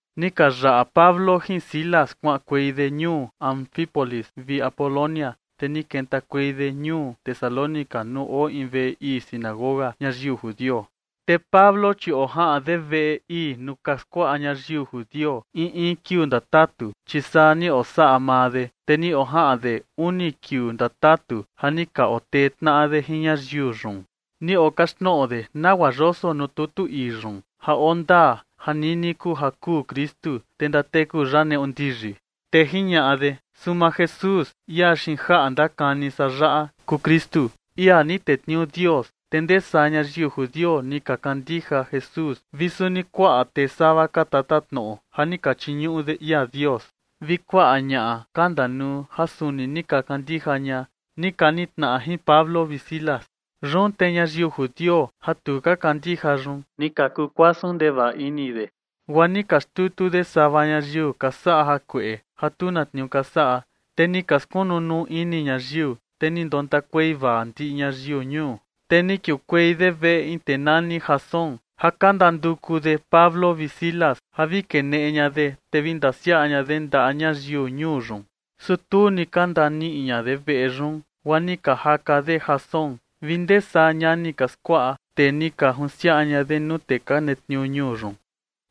Ni ka yaꞌa Pablo jin Silas kuaꞌankuei de ñuu Anfípolis vi Apolonia, te ni kentakuei de ñuu Tesalónica nuu oo in veꞌe ii sinagoga ñayiu judio. Te Pablo, chi ojaꞌan de veꞌe ii nuu ka skuaꞌa ñayiu judio in in kiuu ndatatu, chi saa ni osaꞌa maa de. Te ni ojaꞌan de uni kiuu ndatatu ja ni ka otee tnaꞌa de jin ñayiu yun. Ni okaxtnoꞌo de nagua yoso nuu tutu ii yun ja oo ndaa ja nini kuu ja kuu Kristu, te ndateku ya neꞌu ndiyi. Te jiñaꞌa de: ―Suu maa Jesús, ia xiin jaꞌa ndakani san yaꞌa kuu Kristu, ia ni tetniuu Dios. Te ndee saa ñayiu judio ni ka kandija Jesús vi suni kuaꞌa tee sava ka tatatnoꞌo ja ni ka chiñuꞌu de ia Dios vi kuaꞌa ñaꞌa ka ndanuu ja suni ni ka kandija ña, ni ka nitnaꞌa jin Pablo vi Silas. Yun te ñayiu judio ja tu ka kandija yun ni ka kukuasun ndevaꞌa ini de, guaa ni ka xtutu de sava ñayiu ka saꞌa jakueꞌe ja tu na tniuu ka saꞌa, te ni ka skunu nuu ini ñayiu, te ni ndontakuei vaa ndiꞌi ñayiu ñuu. Te ni kiukuei de veꞌe in tee nani Jasón ja ka ndanduku de Pablo vi Silas ja vi keneꞌe ña de, te vi ndasiaꞌa ña de ndaꞌa ñayiu ñuu yun. Su tu ni ka ndaniꞌi ña de veꞌe yun, guaa ni ka jaka de Jasón vi ndee saa ñani ka skuaꞌa, te ni ka junsiaꞌa ña de nuu tee ka netniuu ñuu yun,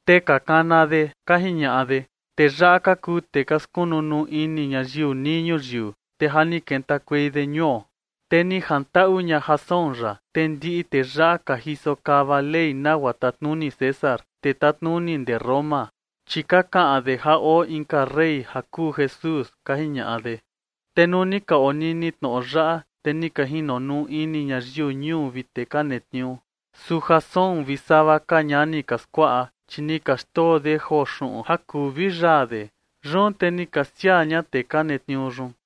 te ka kana de ka jiñaꞌa de: ―Tee yaꞌa ka kuu tee ka skunu nuu ini ñayiu nii ñuyiu, te ja ni kentakuei de ñuo. Te ni jantaꞌu ña Jasón yaꞌa. Te ndiꞌi tee yaꞌa ka jiso kava ley nagua tatnuni César, tee tatnuni ndee Roma, chi ka kaꞌan de ja oo inka rey ja kuu Jesús ―ka jiñaꞌa de. Te nuu ni ka onini tnoꞌo yaꞌa, te ni ka jinonuu ini ñayiu ñuu vi tee ka netniuu. Su Jasón vi sava ka ñani ka skuaꞌa, chi ni ka xndoo de joo xuꞌun ja kuu vi yaa de. Yun te ni ka siaa ña tee ka netniuu yun.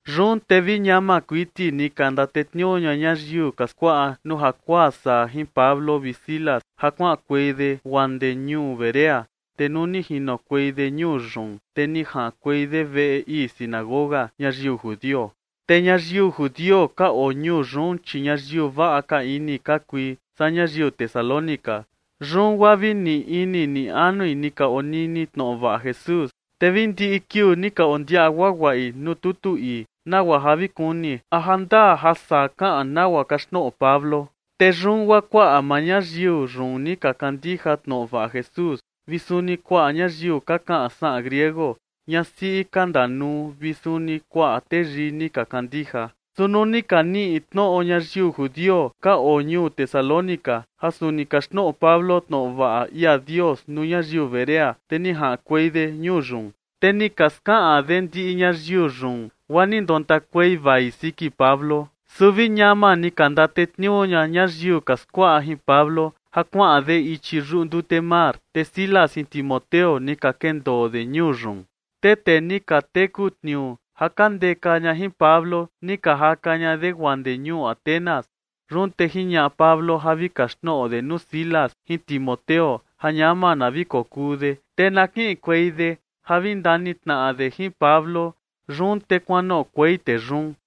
Yun te vi ñama kuiti ni ka ndatetniuu ña ñayiu ka skuaꞌa nuu jakuaa saa jin Pablo vi Silas ja kuaꞌankuei de guaa ndee ñuu Berea. Te nuu ni jinokuei de ñuu yun, te ni jaꞌankuei de veꞌe ii sinagoga ñayiu judio. Te ñayiu judio ka oo ñuu yun, chi ñayiu vaꞌa ka ini ka kui saa ñayiu Tesalónica. Yun guaa vi ni ini ni anui ni ka onini tnoꞌo vaꞌa Jesús, te vi ndiꞌi kiuu ni ka ondiaꞌa guaguaꞌi nuu tutu ii, nagua ja vi kuni a jandaa ja saa kaꞌan nagua kaxtnoꞌo Pablo. Te yun guaa kuaꞌa maa ñayiu yun ni ka kandija tnoꞌo vaꞌa Jesús, vi suni kuaꞌa ñayiu ka kaꞌan saꞌan griego, ñasiꞌi ka ndanuu vi suni kuaꞌa teyii ni ka kandija. Su nuu ni ka niꞌi tnoꞌo ñayiu judio ka oo ñuu Tesalónica ja suni kaxtnoꞌo Pablo tnoꞌo vaꞌa ia Dios nuu ñayiu Berea, te ni jaꞌankuei de ñuu yun, te ni ka skaꞌan de ndiꞌi ñayiu yun, guaa ni ndontakuei vai siki Pablo. Su vi ñama ni ka ndatetniuu ña ñayiu ka skuaꞌa jin Pablo ja kuaꞌan de ichi yuꞌu ndute mar. Te Silas jin Timoteo ni ka kendoo de ñuu yun. Te tee ni ka teku tniuu ja ka ndeka ña jin Pablo ni ka jaka ña de guaa ndee ñuu Atenas. Yun te jiñaꞌa Pablo ja vi kaxtnoꞌo de nuu Silas jin Timoteo ja ñama na vi kokuu de, te na kiꞌinkuei de ja vi ndanitnaꞌa de jin Pablo. Yun te kuanoꞌokuei tee yun.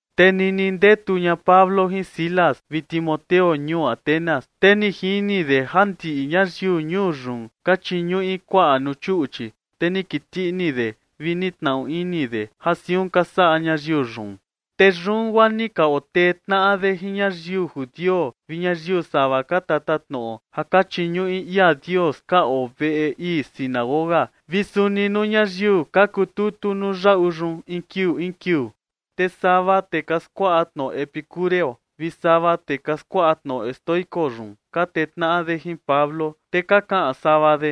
Te nini ndetu ña Pablo jin Silas vi Timoteo ñuu Atenas, te ni jini de ja ndiꞌi ñayiu ñuu yun ka chiñuꞌi kuaꞌa nuu chuꞌchi, te ni kiti ini de vi ni tnaꞌu ini de ja siun ka saꞌa ñayiu yun. Te yun guaa ni ka otee tnaꞌa de jin ñayiu judio vi ñayiu sava ka tatatnoꞌo ja ka chiñuꞌu ia Dios ka oo veꞌe ii sinagoga vi suni nuu ñayiu ka kututu nuu yaꞌu yun in kiuu in kiuu. Te sava tee ka skuaꞌa tnoꞌo epicúreo vi sava tee ka skuaꞌa tnoꞌo estoico yun ka tee tnaꞌa de jin Pablo, te ka kaꞌan sava de: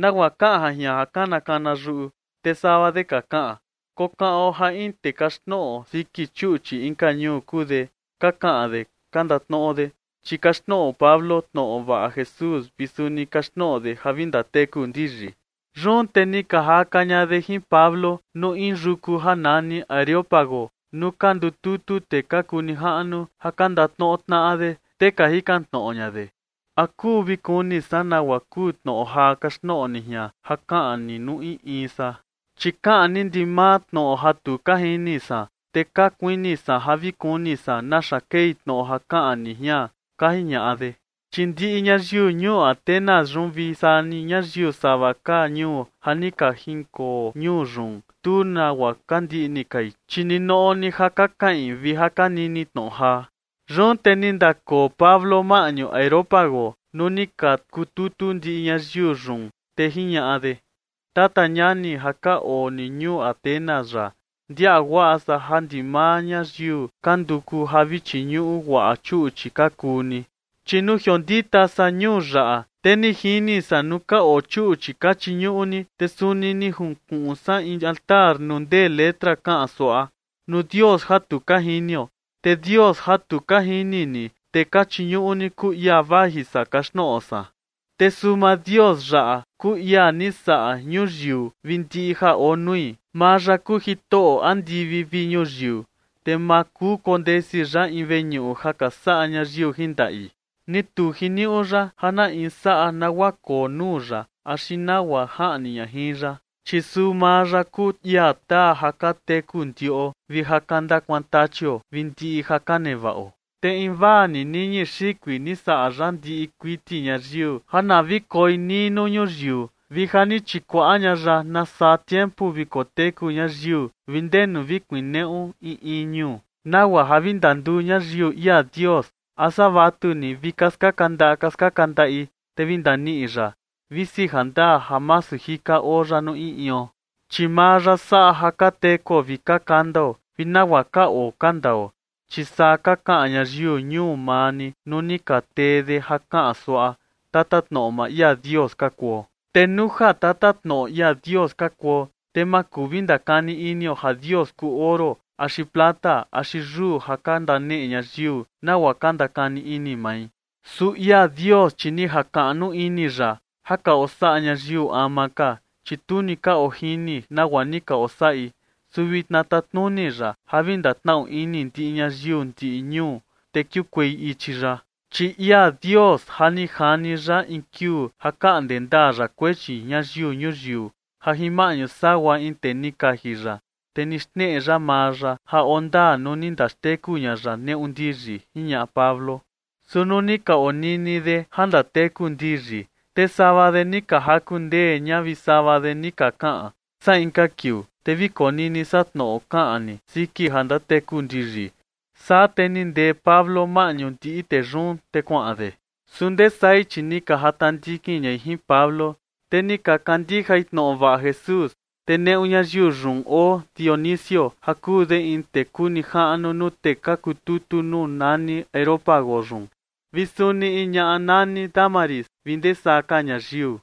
―¿Nagua kaꞌan ja jian ja kana kana yuꞌu? Te sava de ka kaꞌan: ―Kokaꞌon ja in tee kaxtnoꞌo siki chuꞌchi inka ñuu kuu de ―ka kaꞌan de ka ndatnoꞌo de, chi kaxtnoꞌo Pablo tnoꞌo vaꞌa Jesús vi suni kaxtnoꞌo de ja vi ndateku ndiyi. Yun te ni ka jaka ña de jin Pablo nuu in yuku ja nani Areópago nuu ka ndututu tee ka kuu nijaꞌnu ja ka ndatnoꞌo tnaꞌa de, te ka jikan tnoꞌo ña de: ―¿A kuu vi kuni san nagua kuu tnoꞌo jaa kaxtnoꞌo ni jian ja kaꞌan ni nuu in in san? Chi kaꞌan ni ndimaa tnoꞌo ja tu ka jini san. Te ka kuini san ja vi kuni san naxa kei tnoꞌo ja kaꞌan ni jian ―ka jiñaꞌa de. Chi ndiꞌi ñayiu ñuu Atenas yun vi saa ni ñayiu sava ka ñuu ja ni ka jinkoo ñuu yun, tu nagua ka ndiꞌni kai, chi ninoꞌo ni ja ka kaꞌin vi ja ka nini tnoꞌo jaa. Yun te ni ndakoo Pablo maꞌñu Areópago nuu ni ka kututu ndiꞌi ñayiu yun, te jiñaꞌa de: ―Tata ñani ja ka oo ni ñuu Atenas yaꞌa, ndiaꞌa guaꞌa san ja ndimaa ñayiu ka nduku ja vi chiñuꞌu guaꞌa chuꞌchi ka kuu ni. Chi nuu jiondita san ñuu yaꞌa, te ni jini san nuu ka oo chuꞌchi ka chiñuꞌu ni, te suni ni junkuꞌun san in altar nuu ndee letra kaꞌan suaꞌa: “Nuu dios ja tu ka jinio”. Te Dios ja tu ka jini ni, te ka chiñuꞌu ni, kuu ia vaji san kaxtnoꞌo san. ’Te suu maa Dios yaꞌa kuu ia ni saꞌa ñuyiu vi ndiꞌi ja oo nui. Maa ya kuu Jitoꞌo andivi vi ñuyiu, te ma kuu kondesi ya in veñuꞌu ja ka saꞌa ñayiu jin ndaꞌi. Ni tu jiniuꞌu ya ja na in saꞌa nagua koo nuu ya axi nagua jaꞌni ña jin ya. Chi suu maa ya kuu ia taa ja ka teku ndiꞌo vi ja ka ndakuantachio vi ndiꞌi ja ka nevaꞌo. ’Te invaa ni niñi xikui ni saꞌa ya ndiꞌi kuiti ñayiu ja na vi koi nii nuu ñuyiu, vi ja ni chikuaꞌa ña ya na saa tiempu vi koteku ñayiu, vi ndenu vi kuneꞌu in in ñuu, nagua ja vi ndanduu ñayiu ia Dios, a saa vatuni vi ka skaka ndaꞌa ka skaka ndaꞌi, te vi ndaniꞌi ya, visi jandaa ja masu jika oo ya nuu in ion. Chi maa ya saꞌa ja ka tekuo vi ka kandao vi nagua ka oo ka ndao. Chi saa ka kaꞌan ñayiu ñuu maa ni nuu ni ka tee de ja kaꞌan suaꞌa: “Tatatnoꞌo maa ia Dios ka kuo”. ’Te nuu ja tatatnoꞌo ia Dios ka kuo, te ma kuu vi ndakani inio ja Dios kuu oro axi plata axi yuu ja ka ndaneꞌe ñayiu nagua ka ndakani ini mai. Su ia Dios, chi ni jakaꞌnu ini ya ja ka osaꞌa ñayiu ama ka, chi tu ni ka ojini nagua ni ka osaꞌi. Su vitna tatnuni ya ja vi ndatnaꞌu ini ndiꞌi ñayiu ndiꞌi ñuu, te kiukuei ichi ya. Chi ia Dios, ja ni jani ya in kiuu ja kaꞌnde ndaa ya kuechi ñayiu ñuyiu ja jin maꞌñu sagua in tee ni kaji ya. Te ni xneꞌe ya maa ya ja oo ndaa nuu ni ndaxteku ña ya neꞌu ndiyi ―jiñaꞌa Pablo. Su nuu ni ka onini de ja ndateku ndiyi, te sava de ni ka jaku ndee ña vi sava de ni ka kaꞌan: ―Saa inka kiuu, te vi konini san tnoꞌo kaꞌan ni siki ja ndateku ndiyi. Saa te ni ndee Pablo maꞌñu ndiꞌi tee yun, te kuaꞌan de. Su ndee sai, chi ni ka jata ndikin ñai jin Pablo, te ni ka kandijai tnoꞌo vaꞌa Jesús. Te neꞌu ñayiu yun oo Dionisio, ja kuu de in tee kuu nijaꞌnu nuu tee ka kututu nuu nani Areópago yun, vi suni in ñaꞌa nani Dámaris vi ndesaa ka ñayiu.